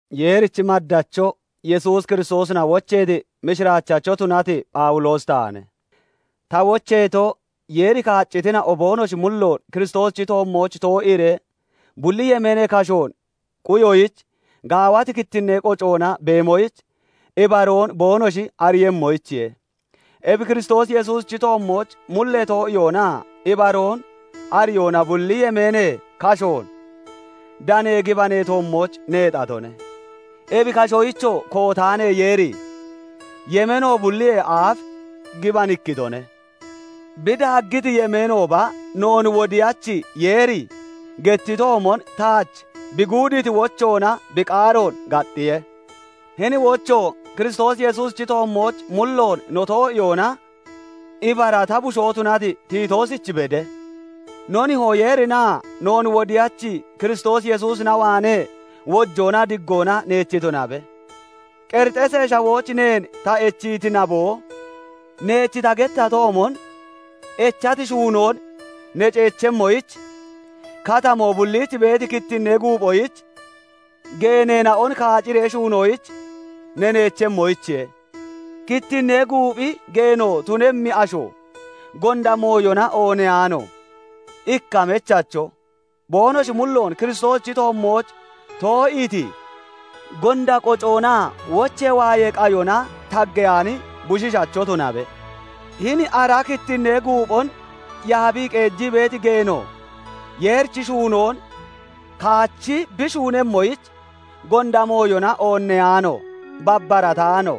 Yeerichi maddacho, Yesuus Kiristoosina wocheeti mishiraachacho tunati Phawuloosi taane; ta wocheeto, Yeeri kaaccitina'o boonoshi mulloon Kiristoosichi toommooch too'iiree, bulli yemeenee kashoon quyoyich, gaawati kittinnee qocoona beemoyich ibaroon boonoshi ariiyemmoyichiye; ebi Kiristoos Yesuusichi toommooch mullee too'iyoonaa ibaroon ariyoona bulli yemeenee kashoon danee gibanee toommooch neexatone; ebi kashoyichoo kootaanee Yeeri, yemeeno bulliyee aaf gibanikkitone. Bi daaggiti yemeenooba, noon Wodiyachi Yeeri gettitoomon taach bi guudiiti wochoona bi qaaroon gaxxiye. Hini wocho Kiristoos Yesuusichi toommooch mulloon no too'iyoona ibara ta bushoo tunati Titoosich bede; no Nihoo Yeerinaa noon wodiyachi Kiristoos Yesuusina waanee wojoonaa diggoona neech tunabe Qerixeesee Shawooch neen ta echiiti naboo, neech ta gettatoomon echati shuunoon ne ceechemmoyich, Katamoo bulliich beeti kittinnee guuphoyich geeneena'on kaaciree shuunoyich ne neechemmoyichiye. Kittinnee guuphi geeno tunemmi asho, gonda mooyona oonneyaano, ikka mechacho, boonoshi mulloon Kiristoosichi toommooch too'iiti, gonda qocoonaa wochee waayee qayona taggeyaani bushiishacho tunabe. Hini ara kittinnee guuphon yaabii qeejii beeti geeno Yeerichi shuunoon kaachi bi shuunemmoyich, gonda mooyona oonneyaano, babbarataano,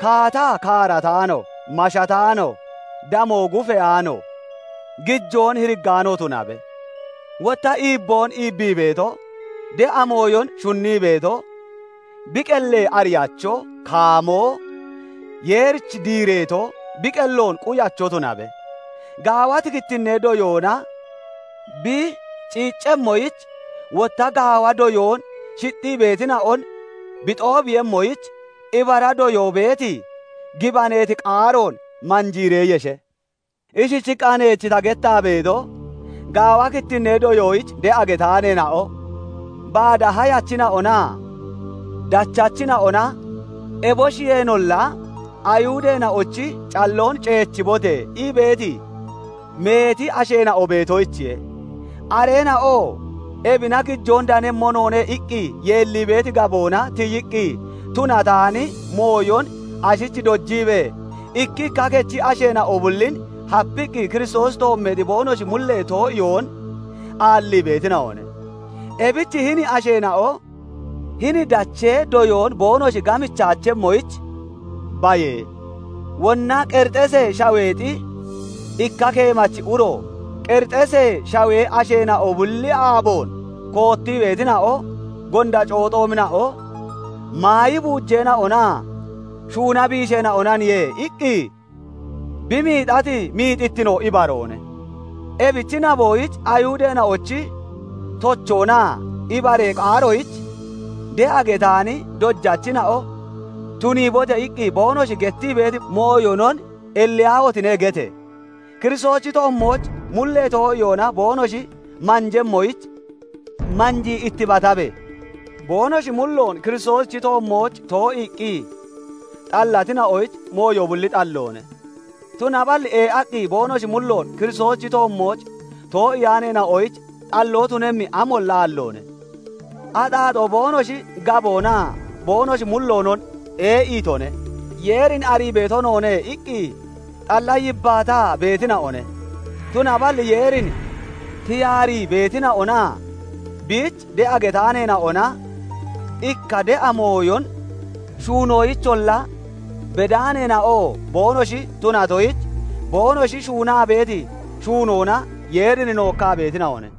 kaataa kaarataano, mashataano, damoo gufeyaano, gijoon hiriggaano tunabe; wotta iibboon iibbii beeto, de'a mooyon shunnii beeto, bi qellee ariyacho, kaamoo, Yeerich diireeto, bi qelloon quyacho tunabe. Gaawati kittinnee doyoona bi ciiccemmoyich, wotta gaawa doyoon shixxii beetina'on bi xoobiiyemmoyich, ibara doyoo beeti, gibaneeti qaaroon manjiiree yeshe. Ishichiqqa neech ta gettaa beeto, gaawa kittinnee doyoyich de'a getaaneena'o, baada hayachina'onaa (nabachina'onaa) dachachina'ona, eboshiyeenolla "Ayihudeena'ochi calloon ceechibote!" ii beeti meeti asheena'o beetoyichiye; areena'oo "Ebina gijoon danemmo noone" iqqi yeellii beeti gaboona tiyiqqi tunataani mooyon ashich dojiibee, ikkikka kechi asheena'o bullin hapiqqi Kiristoosi toommeexi boonoshi mullee too'iyoon aallii beetina'one; ebich hini asheena'o hini dachee doyoon boonoshi gamichaachemmoyich baye! Wonna Qerixeesee Shaweexi ikka keemachi uro "Qerixeesee Shawee asheena'o bulli aaboon koottii beetina'o, gonda cooxoomina'o, maayi buujeena'onaa shuuna biisheena'onaniye" iqqi, bi miixati miixittino ibaroone. Ebichi naboyich Ayihudeena'ochi tochoonaa ibaree qaaroyich de'a getaani dojachina'o "Tuniibote!" iqqi boonoshi gettii beeti mooyonon "Elliyaahotine!" gete! Kiristoosichi toommooch mullee too'iyoona boonoshi manjemmoyich manjii ittibatabe! Boonoshi mulloon Kiristoosichi toommooch too'iiqqi xallatina'oyich mooyo bulli xalloone; tunaballi ee'aqqi boonoshi mulloon Kiristoosichi toommooch too'iyaaneena'oyich xalloo tunemmi amolla aalloone; axaaxoo boonoshi gaboonaa boonoshi mulloonon ee'iitone. "Yeerin arii beeto noone" iqqi xalla yibbaataa beetina'one; tunaballi Yeerin tiyaarii beetina'onaa biich de'a getaaneena'ona, ikka de'a mooyon shuunoyicholla bedaaneena'oo boonoshi tunatoyich, boonoshi shuunaa beeti shuunoona Yeerin nookkaa beetina'one.